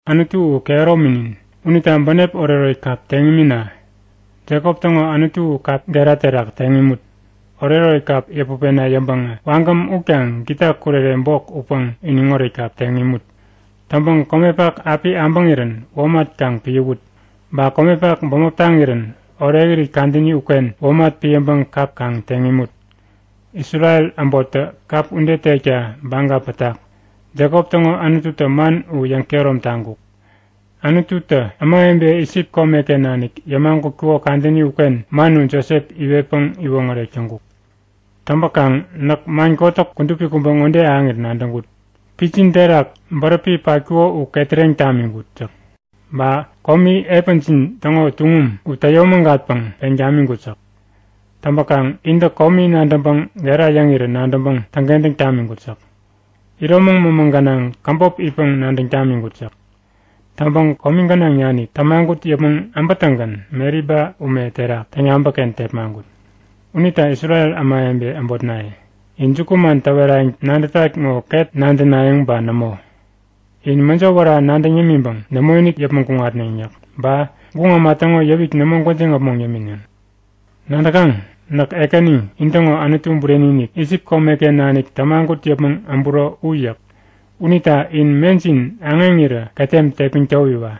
Anutu u kehärominin. Unita bänep oretoret kap teŋ imina. Jekop täŋo Anutu u kap gera terak teŋ imut. Oretoret kap yäput pena yäŋpäŋä wagäm utkaŋ gita kurere bok utpäŋ iniŋoret kap teŋ imut. Täŋpäŋ komepak api äbäŋirän womat kaŋ piäwut, ba komepak bämop taŋirän orekirit kadäni uken womat piäŋpäŋ kap kaŋ teŋ imut. Isrel äbottä kap ude tekta baga pätak. Jekop täŋo Anututä man u yäŋkehärom taŋkuk. Anututä ämawebe Isip komeken nanik yämagutkuko kadäni uken man u Josep iwetpäŋ iwoŋärek täŋkuk. Täŋpäkaŋ näk man kotäk kudupi kubä ŋode ahäŋirän nadäŋkut; Pitjin terak bäräpi patkuko u ketäreŋ tamiŋkut yäk. Ba komi epänjin täŋo tuŋum u täyomägatpäŋ peŋ tamiŋkut yäk. Täŋpäkaŋ intä komi nadäŋpäŋ gera yäŋirä nadäŋpäŋ täŋkentäŋ tamiŋkut yäk. Iromäŋ mämä gänaŋ käbop itpäŋ nadäŋ tamiŋkut yäk. Täŋpäŋ komi gänaŋ nanik tämagut yäpmäŋ äbätäŋgän Meriba ume terak täŋyabäkken tepmaŋkut. Unita Isrel ämawebe äbotnaye, in jukuman täwerayäŋ nadätat ŋo ket nadänayäŋ ba nämo? In mäjo wära nadäŋ yämiŋpäŋ nämoinik yäpmäŋ kuŋatneŋ yäk. Ba guŋ äma täŋo yäwik nämo gwäjiŋ äpmoŋ yämineŋ. Nadäkaŋ? Näk Ekäni, intäŋo Anutu bureni-inik. Isip komeken nanik tämagut yäpmäŋ äburo u yäk. Unita in mejin aŋeŋirä ketem tepmäŋ towiwa.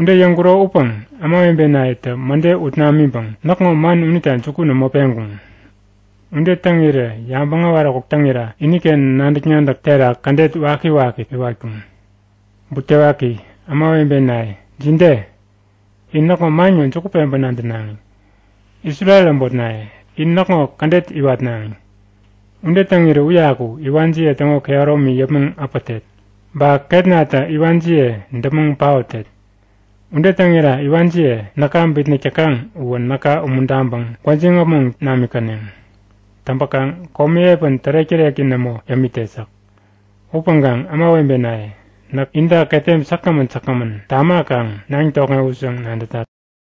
Ude yäŋkuro upäŋ ämawebenayetä mäde ut namiŋpäŋ näkŋo man unita juku nämo peŋkuŋ. Ude täŋirä yabäŋ äwaräkuk täŋira iniken nadäk-nadäk terak kädet wakiwaki iwatkuŋ. Butewaki! Ämawebenaye, jide? In näkŋo man ŋo juku peŋpäŋ nadänaŋi. Isrel äbotnaye, in näkŋo kädet iwatnaŋi. Ude täŋirä uyaku iwanjiye täŋo kehäromi yäpmäŋ äpätet. Ba ketnatä iwanjiye däpmäŋ paotet. Ude täŋira iwanjiye, näka bitnäk täkaŋ uwä näka umuntaŋpäŋ gwäjiŋ äpmoŋ namikäneŋ. Täŋpäkaŋ komi epän tärek-täreki nämo yämitet yäk. Upäŋkaŋ ämawebenaye, näk inta ketem säkgämän säkgämän tamakaŋ naŋ tokŋewut yäŋ nadätat.